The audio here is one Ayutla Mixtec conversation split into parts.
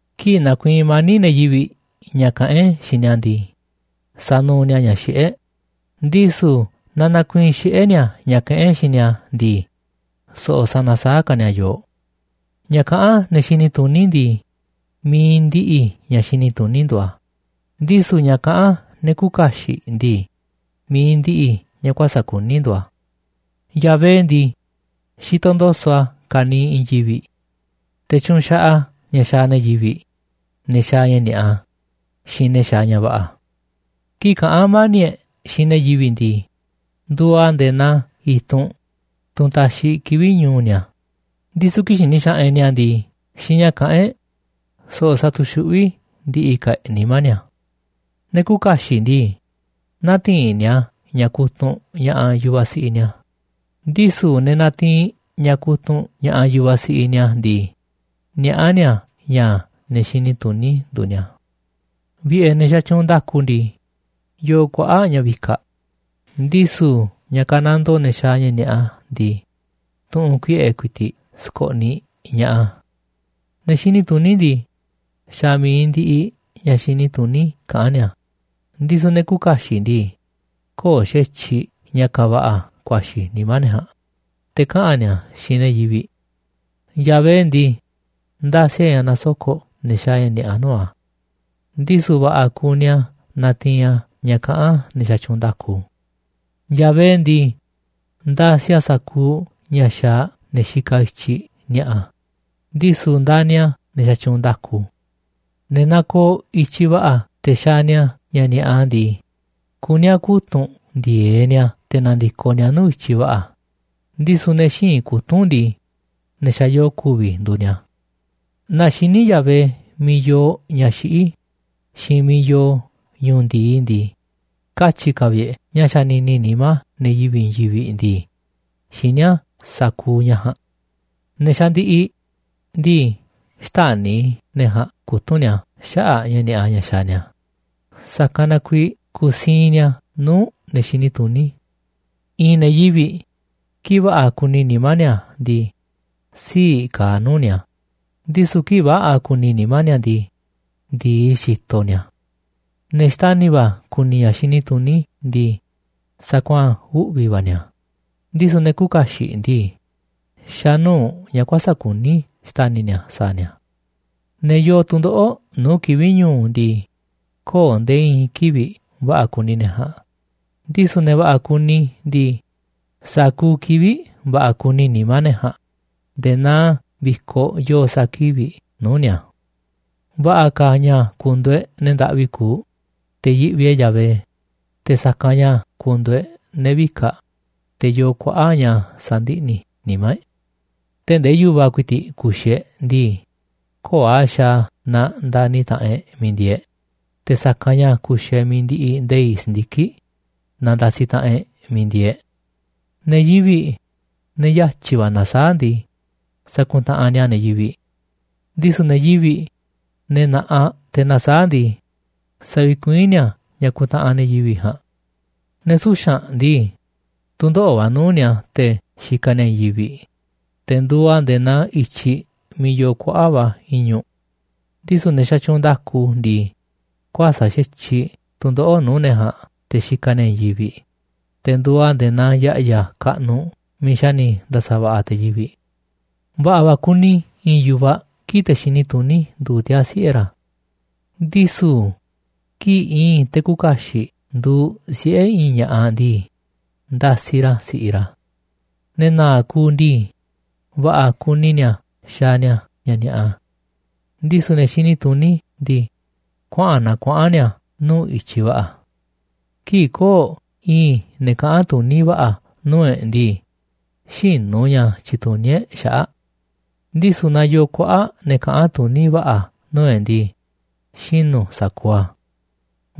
Kii̱ꞌ nakuiinꞌ mani̱ꞌ ne̱ yivi̱ꞌ ña̱ kaꞌán e̱ꞌ xiinꞌ ni̱a̱ ndii, sanuuꞌ ni̱a̱ ña̱ xiꞌé e̱ꞌ, ndisu̱ naaꞌ nakuiinꞌ xiꞌé ni̱a̱ ña̱ kaꞌán e̱ꞌ xiinꞌ ni̱a̱ ndii, so̱ꞌo̱ sanasaáꞌ ka̱ ni̱a̱ yooꞌ. Ña̱ kaꞌán ne̱ xini tuní ndii, mi̱iꞌ ndiꞌiꞌ ña̱ xini tuní nduuꞌ a̱, ndisu̱ ña̱ kaꞌán ne̱ küuꞌ kaxiꞌ ndii, mi̱iꞌ ndiꞌiꞌ ña̱ kuäsa̱ꞌ kuní nduuꞌ a̱. Yahvé ndii, xitoꞌ ndo̱so̱ꞌ a̱ ka̱niiꞌ i̱i̱n yivi̱ꞌ, te̱ tyuunꞌ xaꞌaꞌ a̱ ña̱ xaaꞌ ne̱ yivi̱ꞌ, ne̱ xaaꞌ ña̱ ni̱a̱ꞌa xiinꞌ ne̱ xaaꞌ ña̱ va̱ꞌa̱. Kii̱ꞌ kaꞌán mani̱ꞌ e̱ꞌ xiinꞌ ne̱ yivi̱ꞌ ndii, nduuꞌ a̱ nde̱e̱ naa i̱tunꞌ, tunꞌ taxiꞌ kivi̱ꞌ ñu̱u̱ ni̱a̱, ndisu̱ kii̱ꞌ xini xaꞌanꞌ e̱ꞌ ni̱a̱ ndii xiinꞌ ña̱ káꞌa̱n e̱ꞌ, so̱ꞌo̱ satuxuꞌví ndi̱ꞌi̱ ka̱ e̱ꞌ nimá ni̱a̱. Ne̱ küuꞌ kaxiꞌ ndii, nätiinꞌ ni̱a̱ ña̱ kutunꞌ ña̱ꞌaꞌ yu̱vaꞌ siꞌiꞌ ni̱a̱, ndisu̱ ne̱ natiinꞌ ña̱ kutunꞌ ña̱ꞌaꞌ yu̱vaꞌ siꞌiꞌ ni̱a̱ ndii, niaꞌá ni̱a̱ ña̱ ne̱ xini tuní nduuꞌ ni̱a̱. Vi̱ꞌe̱ ne̱ xatyuunꞌ nda̱ku ndii, yooꞌ kuaꞌa̱ꞌ ña̱ vikaꞌ, ndisu̱ ña̱ kanandoo ne̱ xaaꞌ ña̱ ni̱a̱ꞌa ndii, tu̱ꞌu̱n kuiꞌe̱ ku̱i̱ti̱ꞌ skoꞌniꞌ ña̱ꞌaꞌ a̱. Ne̱ xini tuní ndii, xa̱ mi̱iꞌ ndiꞌiꞌ ña̱ xini tuní kaꞌán ni̱a̱, ndisu̱ ne̱ küuꞌ kaxiꞌ ndii, köo̱ꞌ xa̱tyiꞌ ña̱ kaaꞌ va̱ꞌa̱ ku̱a̱xi̱ nimá ne̱ ja̱a̱nꞌ, te̱ kaꞌa̱n ni̱a̱ a̱ xiinꞌ ne̱ yivi̱ꞌ. Yahvé ndii, ndasiꞌ a̱ ña̱ nasoko̱ꞌ ne̱ xaaꞌ ña̱ ni̱a̱ꞌa nuu̱ꞌ a̱, ndisu̱ va̱ꞌa̱ kuni a̱ natiinꞌ a̱ ña̱ kaꞌán ne̱ xatyuunꞌ nda̱ku. Yahvé ndii, ndasiꞌ a̱ sa̱kuuꞌ ña̱ xaaꞌ ne̱ xikaꞌ i̱tyiꞌ ni̱a̱ꞌa, ndisu̱ ndani̱ a̱ ne̱ xatyuunꞌ nda̱ku. Ne̱ nakooꞌ i̱tyiꞌ va̱ꞌa̱ te̱ xaaꞌ ni̱a̱ ña̱ ni̱a̱ꞌa ndii, kuní a̱ kutu̱nꞌ ndi̱e̱eꞌ ni̱a̱ te̱ na̱ndi̱koꞌ ni̱a̱ nuu̱ꞌ i̱tyiꞌ va̱ꞌa̱, ndisu̱ ne̱ xïinꞌ kutu̱nꞌ ndii, ne̱ xa̱ yoo ku̱vi̱ nduuꞌ ni̱a̱. Naaꞌ xiní Yahvé miiꞌ yoo ña̱ xiꞌí xiinꞌ miiꞌ yoo ñu̱u̱ ndi̱i ndii, katyi̱ ka̱ vi̱ꞌ e̱ꞌ ña̱ xanini nimá ne̱ yivi̱ꞌ i̱i̱n yivi̱ꞌ ndii, xiní a̱ sa̱kuuꞌ ña̱ ja̱a̱nꞌ. Ne̱ xandiꞌiꞌ ndii, xtäni̱ ne̱ ja̱a̱nꞌ kutu̱nꞌ ni̱a̱ xaꞌa̱ꞌ ña̱ ni̱a̱ꞌa ña̱ xaaꞌ ni̱a̱, sa̱kanꞌ na kuiiꞌ kusiinꞌ ni̱a̱ nuu̱ꞌ ne̱ xini tuní. I̱i̱n ne̱ yivi̱ꞌ, kii̱ꞌ va̱ꞌa̱ kuni nimá ni̱a̱ ndii, sii̱ꞌ kaaꞌ nuu̱ꞌ ni̱a̱, ndisu̱ kii̱ꞌ väꞌa̱ kuni nimá ni̱a̱ ndii, ndi̱i, xitoꞌ ni̱a̱. Ne̱ xtani̱ va̱ ku̱ni̱ ña̱ xini tuní ndii, sakuaa̱n uꞌvi̱ va̱ ni̱a̱ a̱, ndisu̱ ne̱ küuꞌ kaxiꞌ ndii, xa̱ nuu̱ꞌ ña̱ kuäsa̱ꞌ kuní xtani̱ ni̱a̱ sa̱a̱ ni̱a̱. Ne̱ yoo tu̱ndoꞌo̱ꞌ nuu̱ꞌ kivi̱ꞌ ñu̱u̱ ndii, köo̱ꞌ nde̱e̱ i̱i̱n kivi̱ꞌ va̱ꞌa̱ kuni ne̱ ja̱a̱nꞌ, ndisu̱ ne̱ va̱ꞌa̱ kuni ndii, sa̱kuuꞌ kivi̱ꞌ va̱ꞌa̱ kuni nimá ne̱ ja̱a̱nꞌ nde̱e̱ naa vi̱koꞌ yoo sa̱a̱ kivi̱ꞌ nuu̱ꞌ ni̱a̱. Va̱ꞌa̱ ka̱ ña̱ ku̱ndu̱u̱ e̱ꞌ ne̱ ndaꞌvi kuuꞌ, te̱ yiꞌvi e̱ꞌ Yahvé, te̱ sa̱kanꞌ ña̱ ku̱ndu̱u̱ e̱ꞌ ne̱ vika̱ꞌ, te̱ yoo kuaꞌa̱ꞌ ña̱ sandiꞌni̱ nimá e̱ꞌ. Tee̱ꞌ ndee yu̱va̱ ku̱i̱ti̱ꞌ ku̱xi̱ e̱ꞌ ndii, köo̱ꞌ a̱ xaaꞌ a̱ naaꞌ ndani̱ taꞌanꞌ e̱ꞌ miiꞌ ndieeꞌ e̱ꞌ, te̱ sa̱kanꞌ ña̱ ku̱xi̱ e̱ꞌ mi̱iꞌ ndiꞌiꞌ nde̱i̱ꞌ si̱ndiki̱ꞌ naaꞌ ndasiꞌ taꞌanꞌ e̱ꞌ miiꞌ ndieeꞌ e̱ꞌ. Ne̱ yivi̱ꞌ, ne̱ yatyi̱ va̱ nasaáꞌ ndii, sakuntaꞌanꞌ ni̱a̱ ne̱ yivi̱ꞌ, ndisu̱ ne̱ yivi̱ꞌ, ne̱ na̱ꞌaꞌ te̱ nasaáꞌ ndii, savikuiín ni̱a̱ ña̱ kuntaꞌanꞌ ne̱ yivi̱ꞌ ja̱a̱nꞌ. Ne̱ suxa̱nꞌ ndii, tu̱ndoꞌo̱ꞌ va̱ nuu̱ꞌ ni̱a̱ te̱ xikaꞌ ni̱a̱ i̱i̱n yivi̱ꞌ, te̱ nduuꞌ a̱ nde̱e̱ naa i̱tyiꞌ miiꞌ yoo kuaꞌa̱ꞌ va̱ i̱ñu̱ꞌ, ndisu̱ ne̱ xatyuunꞌ nda̱ku ndii, kuäsa̱ꞌ xa̱tyiꞌ tu̱ndoꞌo̱ꞌ nuu̱ꞌ ne̱ ja̱a̱nꞌ te̱ xikaꞌ ni̱a̱ i̱i̱n yivi̱ꞌ, te̱ nduuꞌ a̱ nde̱e̱ naa ya̱ꞌya̱ kaꞌnuꞌ miiꞌ xa̱ ni̱ nda̱sa̱va̱ꞌa̱ te̱ yivi̱ꞌ. Va̱ꞌa̱ va̱ kuni i̱i̱n yu̱vaꞌ kii̱ꞌ te̱ xini tuní nduuꞌ tiaa̱ siꞌe̱ ra̱, ndisu̱ kii̱ꞌ i̱i̱n te̱ küuꞌ kaxiꞌ nduuꞌ siꞌe̱ i̱i̱n ña̱ꞌaꞌ ndii, ndasiꞌ ra̱ si̱ꞌiꞌ ra̱. Ne̱ na̱a̱ꞌ kuuꞌ ndii, va̱ꞌa̱ kuni ni̱a̱ xaaꞌ ni̱a̱ ña̱ ni̱a̱ꞌa, ndisu̱ ne̱ xini tuní ndii, kuaꞌa̱n naa kuaꞌa̱n ni̱a̱ nuu̱ꞌ i̱tyiꞌ va̱ꞌa̱. Kii̱ꞌ köo̱ꞌ i̱i̱n ne̱ kaꞌa̱n tuní va̱ꞌa̱ nuu̱ꞌ e̱ꞌ ndii, xïnu̱ ña̱ tyituní e̱ꞌ xaꞌa̱ꞌ, ndisu̱ naaꞌ yoo kuaꞌa̱ꞌ ne̱ kaꞌa̱n tuní va̱ꞌa̱ nuu̱ꞌ e̱ꞌ ndii, xinu̱ sa̱kuuꞌ a̱.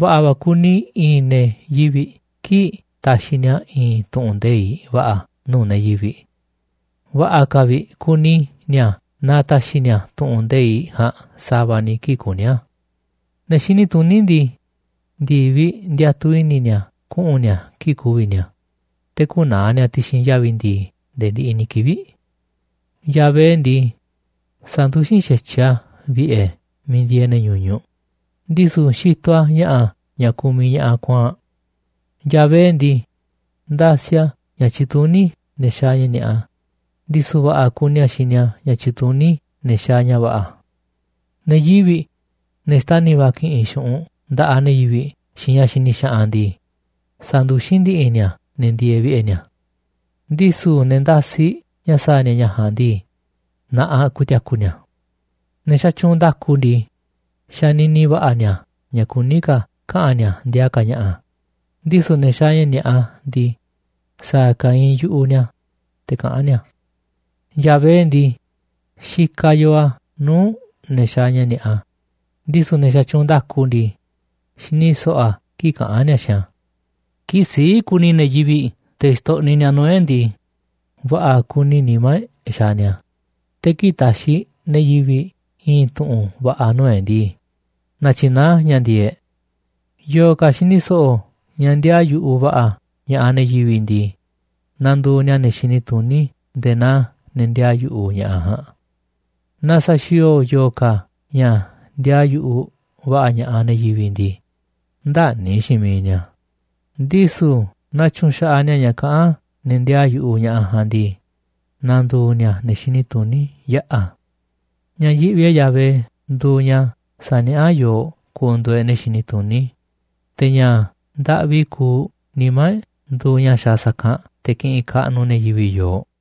Va̱ꞌa̱ va̱ kuni i̱i̱n ne̱ yivi̱ꞌ kii̱ꞌ taxiꞌ ni̱a̱ i̱i̱n tu̱ꞌu̱n nde̱iꞌ va̱ꞌa̱ nuu̱ꞌ ne̱ yivi̱ꞌ. Va̱ꞌa̱ ka̱ vi̱ꞌ kuni ni̱a̱ naaꞌ taxiꞌ ni̱a̱ tu̱ꞌu̱n nde̱iꞌ ja̱a̱nꞌ sa̱va̱ ni̱ kii̱ꞌ kuní a̱. Ne̱ xini tuní ndii, ndi̱viꞌ ndiatuꞌ i̱ni̱ ni̱a̱ kuꞌu̱n ni̱a̱ kii̱ꞌ ku̱vi̱ ni̱a̱, te̱ kü̱naa̱ ni̱a̱ ti̱xi̱n yavi̱ ndi̱i̱ nde̱e̱ ndiꞌiꞌ ni̱ kivi̱ꞌ. Yahvé ndii, sanduxín xa̱tyiꞌ a̱ vi̱ꞌe̱ miiꞌ ndieeꞌ ne̱ ñuñuꞌ, ndisu̱ xitoꞌ a̱ ña̱ꞌa̱ ña̱ kumiꞌ ña̱ꞌaꞌ kuaa̱nꞌ. Yahvé ndii, ndasiꞌ a̱ ña̱ tyituní ne̱ xaaꞌ ña̱ ni̱a̱ꞌa, ndisu̱ va̱ꞌa̱ kuni a̱ xini a̱ ña̱ tyituní ne̱ xaaꞌ ña̱ va̱ꞌa̱. Ne̱ yivi̱ꞌ, ne̱ xtani̱ va̱ ki̱ꞌi̱n xu̱ꞌunꞌ nda̱ꞌaꞌ ne̱ yivi̱ꞌ xiinꞌ ña̱ xini xaꞌanꞌ ndii, sanduxín ndi̱ꞌi̱ ni̱a̱ ne̱ ndieeꞌ vi̱ꞌe̱ ni̱a̱, ndisu̱ ne̱ ndasiꞌ ña̱ sa̱a̱ ni̱a̱ ña̱ ja̱a̱nꞌ ndii, na̱ꞌaꞌ ku̱ti̱a̱ku̱ ni̱a̱. Ne̱ xatyuunꞌ nda̱ku ndii, xanini va̱ꞌa̱ ni̱a̱ ña̱ kuní ka̱ kaꞌa̱n ni̱a̱ ndiaa ka̱ ña̱ꞌa̱, ndisu̱ ne̱ xaaꞌ ña̱ ni̱a̱ꞌa ndii, sa̱a̱ ka̱ iinꞌ yu̱ꞌuꞌ ni̱a̱, te̱ kaꞌán ni̱a̱. Yahvé ndii, xikaꞌ yoo a̱ nuu̱ꞌ ne̱ xaaꞌ ña̱ ni̱a̱ꞌa, ndisu̱ ne̱ xatyuunꞌ nda̱ku ndii, xini so̱ꞌo̱ a̱ kii̱ꞌ kaꞌán ni̱a̱ xiinꞌ a̱. Kii̱ꞌ sii̱ꞌ kuni ne̱ yivi̱ꞌ te̱ xtoꞌniꞌ ni̱a̱ nuu̱ꞌ e̱ꞌ ndii, va̱ꞌa̱ kuni nimá e̱ꞌ xaaꞌ ni̱a̱, te̱ kii̱ꞌ taxiꞌ ne̱ yivi̱ꞌ i̱i̱n tu̱ꞌu̱n va̱ꞌa̱ nuu̱ꞌ e̱ꞌ ndii, natyinaá a̱ ña̱ ndi̱e̱e̱ꞌ e̱ꞌ. Yo̱o̱ ka̱ xini so̱ꞌo̱ ña̱ ndiaa yu̱ꞌuꞌ va̱ꞌa̱ ña̱ꞌaꞌ ne̱ yivi̱ꞌ ndii, na̱ndu̱u̱ ni̱a̱ ne̱ xini tuní nde̱e̱ naa ne̱ ndiaa yu̱ꞌuꞌ ña̱ꞌaꞌ ja̱a̱nꞌ. Naaꞌ sa̱xi̱o̱o̱ yo̱o̱ ka̱ ña̱ ndiaa yu̱ꞌuꞌ va̱ꞌa̱ ña̱ꞌaꞌ ne̱ yivi̱ꞌ ndii, ndäni̱ xiinꞌ miiꞌ ni̱a̱, ndisu̱ naaꞌ tyu̱nxaꞌaꞌ ni̱a̱ ña̱ kaꞌán ne̱ ndiaa yu̱ꞌuꞌ ña̱ꞌaꞌ ja̱a̱nꞌ ndii, na̱ndu̱u̱ ni̱a̱ ne̱ xini tuní yaꞌa̱. Ña̱ yiꞌvi e̱ꞌ Yahvé nduuꞌ ña̱ saniaꞌá yooꞌ ku̱ndu̱u̱ e̱ꞌ ne̱ xini tuní, te̱ ña̱ ndaꞌvi kuuꞌ nimá e̱ꞌ nduuꞌ ña̱ xaaꞌ sa̱kanꞌ te̱ kiꞌinꞌ kaꞌnuꞌ ne̱ yivi̱ꞌ yooꞌ.